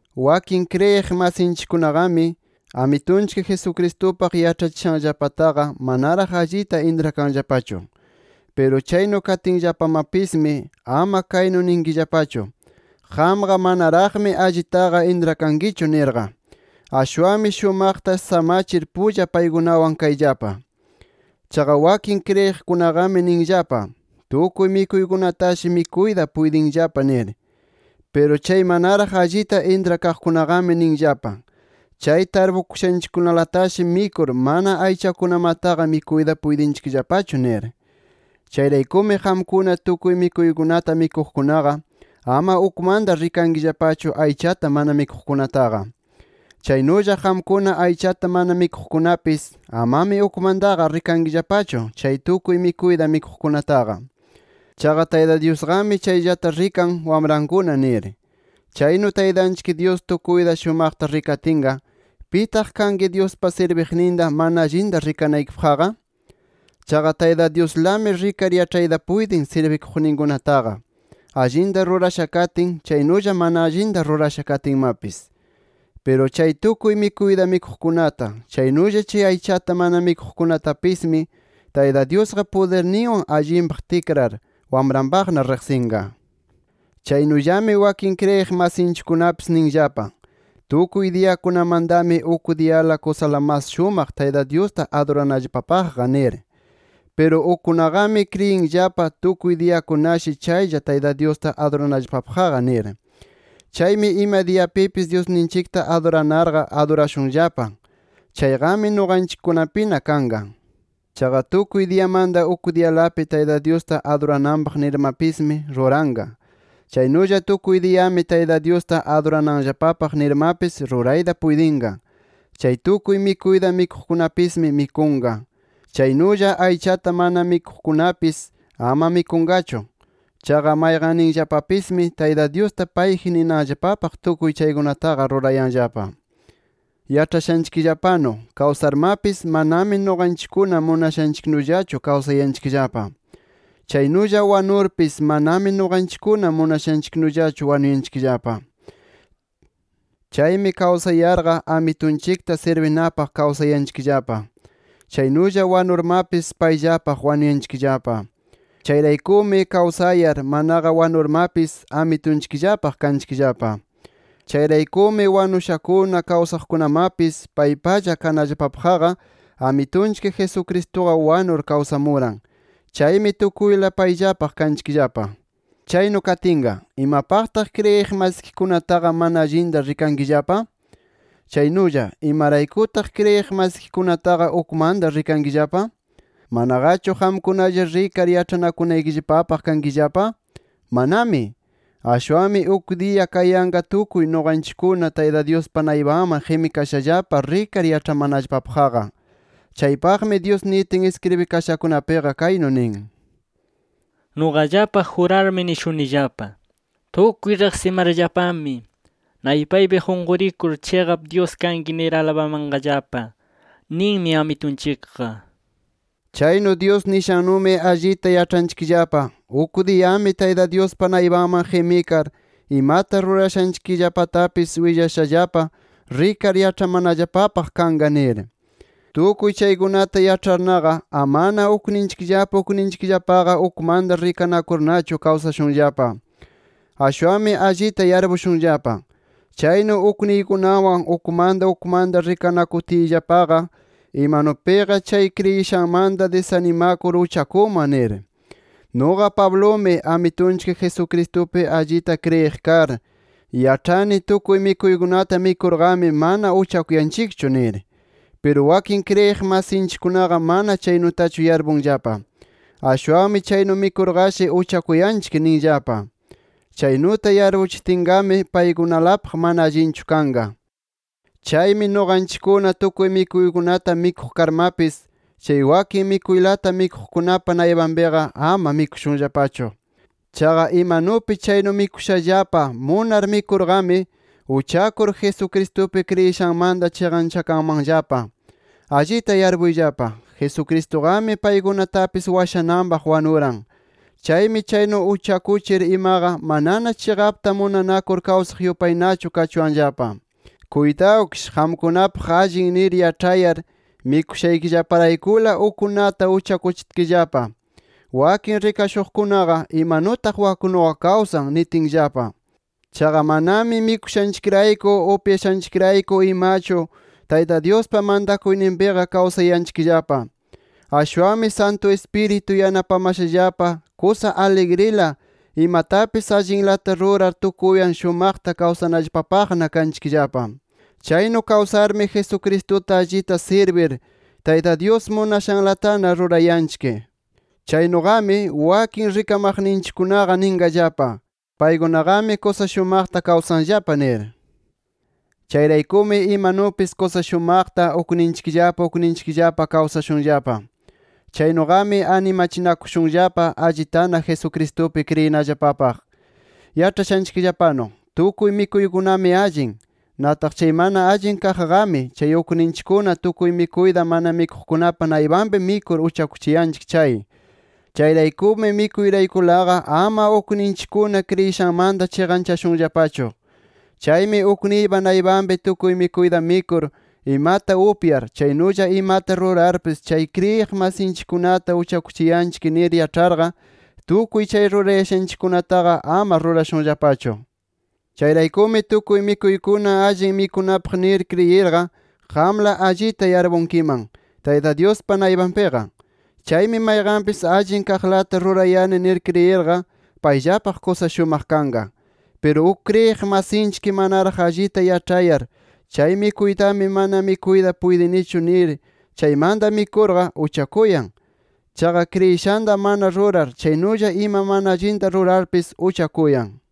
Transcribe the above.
Wakin kriyiq masinchikkunaqami Amitunchik Jesucristupaq yaĉhachishanllapataqa manaraq allita intrakanllapachu. Piru chaynu katinllapamapismi ama kaynu ninkillapachu: “Qamqa manaraqmi allitaqa intrakankichu” nirqa. Ashwanmi shumaqta samachir pulla paykunawan kayllapa. Chaqa wakin kriyiqkunaqami ninllapa: Tukuy mikuykunatashi mikuyta puytinllapa nir. Piru chay manaraq allita intrakaqkunaqami ninllapa: Chay tarpukushankunalatashi mikur, mana aychakunamataqa mikuyta puytinllapachu nir. Chayraykumi qamkuna tukuy mikuykunata mikuqkunaqa, ama ukmanta rikankillapachu aychata mana mikuqkunataqa. Chaynulla qamkuna aychata mana mikuqkunapis, amami ukmantaqa rikankillapachu chay tukuy mikuyta mikuqkunataqa. Chaqa Tayta Dyusqami chayllata rikan wamrankuna nir. Chaynu Taytanchik Dyus tukuyta shumaqta rikatinqa, ¿pitaq kanki Dyuspa sirbiqninta mana allinta rikanaykipaqqa? Chaqa Tayta Dyuslami rikar yaĉhayta puytin, sirbiqninkunataqa, allinta rurasha katin, chaynulla mana allinta rurasha katinmapis. Piru, chay tukuy mikuyta mikuqkunata, chaynulla chay aychata mana mikuqkunamatapismi, Tayta Dyusqa pudirninwan allinpaq tikrar, wamranpaqna riqsinqa. Chaynullami wakin kriyiq masinchikkunapis ninllapa: Tukuy diyakunamantami uk diyala kusa mas shumaq, Tayta Dyusta aduranallapapaqqa nir. Piru ukkunaqami kriyinllapa, tukuy diyakunashi chaylla Tayta Dyusta aduranallapapaqqa nir. Chaymi ima diyapipis Dyusninchikta aduranarqa, adurashunllapa. Chayqami nuqanchikkunapina kanqa. Chaqa tukuy diyamanta uk diyalapi, Tayta Dyusta adurananpaq nirmapismi ruranqa. Chaynulla tukuy diyami Tayta Dyusta adurananllapapaq nirmapis rurayta puytinqa. Chay tukuy mikuyta mikuqkunapismi mikunqa. Chaynulla aychata mana mikuqkunapis ama mikunqachu. Chaqa, mayqanninllapapismi Tayta Dyusta payji ninanllapapaq tukuy chaykunataqa rurayanllapa. Yaĉhashanchikllapanu kawsarmapis manami nuqanchikkuna munashanchiknullachu kawsayanchikllapa. Chaynulla wanurpis, manami nuqanchikkuna munashanchiknullachu wanuyanchikllapa. Chaymi kawsayarqa Amitunchikta sirbinapaq kawsayanchikllapa. Chaynulla wanurmapis, payllapaq wanuyanchikllapa. Chayraykumi kawsayar, manaqa wanurmapis, Amitunchikllapaq kanchikllapa. Chayraykumi wanushakuna, kawsaqkunamapis paypalla kanallapapaqqa, Amitunchik Jesucristuqa wanur kawsamuran. Chaymi tukuyla payllapaq kanchikllapa. Chaynu katinqa, ¿imapaqtaq kriyiq masikikunataqa mana allinta rikankillapa? Chaynulla ¿imaraykutaq kriyiq masikikunataqa ukmanta rikankillapa? ¿Manaqachu qamkunalla rikar yaĉhanakunaykillapapaq kankillapa? ¡Manami! Ashwanmi uk diya kayanqa tukuy nuqanchikkuna Tayta Dyuspa naypanman qimikashallapa rikar yaĉhamanallapapaqqa. Chaypaqmi Dyus nitin iskribikashakunapiqa kaynu nin: “Nuqallapaq jurarmi nishunillapa: ‘Tukuy riqsimarllapami, naypaypi qunqurir chiqap Dyus kanki nir alabamanqallapa’ ninmi Amitunchikqa”. Chaynu Dyus nishannumi allita yaĉhanchikllapa, uk diyami Tayta Dyuspa naypanman qimikar imata rurashanchikllapatapis willashallapa, rikar yaĉhamanallapapaq kanqa nir. Tukuy chaykunata yaĉharnaqa, amana ukninchikllapa ukninchikllapaqa ukmanta rikanakurnachu kawsashunllapa. Ashwanmi allita yarpushunllapa: Chaynu ukniykunawan ukmanta ukmanta rikanakutiyllapaqa, imanupiqa chay kriyishanmanta disanimakur uchakunman nir. Nuqa Pablumi, Amitunchik Jesucristupi allita kriyiq kar, yaĉhani tukuy mikuykunata mikurqami mana uchakuyanchikchu nir. Piru wakin kriyiq masinchikkunaqa mana chaynutachu yarpunllapa. Ashwanmi chaynu mikurqashi, uchakuyanchik ninllapa. Chaynuta yarpuchitinqami, paykunalapaq mana allinchu kanqa. Chaymi nuqanchikkuna tukuy mikuykunata mikuq karmapis, chay wakin mikuylata mikuqkunapa naypanpiqa, ama mikushunllapachu. Chaqa imanupi chaynu mikushallapa, munar mikurqami, uchakur Jesucristupi kriyishanmanta chiqanchakanmanllapa. Allita yarpuyllapa Jesucristuqami, paykunatapis washananpaq wanuran. Chaymi chaynu uchakuchir imaqa, manana chiqapta munanakur kawsaq yupaynachu kachuwanllapa. Kuytawkish qamkunapaq allin nir yaĉhayar, mikushaykillaparaykula ukkunata uchakuchitkillapa, wakin rikashuqkunaqa, “Imanutaq waknuqa kawsan” nitinllapa. Chaqa manami mikushanchikrayku, upyashanchikrayku imachu Tayta Dyuspa mantakuyninpiqa kawsayanchikllapa. Ashwanmi Santu Ispiritu yanapamashallapa kusa aligrila, imatapis allinlata rurar tukuywan shumaqta kawsanallapapaqna kanchikllapa. Chaynu kawsarmi, Jesucristuta allita sirbir, Tayta Dyus munashanlatana rurayanchik. Chaynuqami, wakin rikamaqninchikkunaqa ninqallapa: “Paykunaqami kusa shumaqta kawsanllapa” nir. Chayraykumi imanupis kusa shumaqta ukninchikllapa ukninchikllapa kawsashunllapa. Chaynuqami animachinakushunllapa allitana Jesucristupi kriyinallapapaq. Yaĉhashanchikllapanu, tukuy mikuykunami allin. Nataq chay mana allin kaqqami, chay ukninchikkuna tukuy mikuyta mana mikuqkunapa naypanpi mikur uchakuchiyanchik chay. Chayraykumi mikuyraykulaqa ama ukninchikkuna kriyishanmanta chiqanchashunllapachu. Chaymi ukniypa naypanpi tukuy mikuyta mikur, imata upyar, chaynulla imata rurarpis, chay kriyiq masinchikkunata uchakuchiyanchik nir yaĉharqa, tukuy chay rurayashanchikkunataqa ama rurashunllapachu. Chayraykumi tukuy mikuykuna allin mikunapaq nir kriyirqa, qamla allita yarpunkiman Tayta Dyuspa naypanpiqa. Chaymi mayqanpis allin kaqlata rurayani nir kriyirqa, payllapaq kusa shumaq kanqa. Piru uk kriyiq masinchik manaraq allita yaĉhayar, kay mikuytami mana mikuyta puytinichu nir chaymanta mikurqa, uchakuyan. Chaqa kriyishanta mana rurar, chaynulla ima mana allinta rurarpis uchakuyan.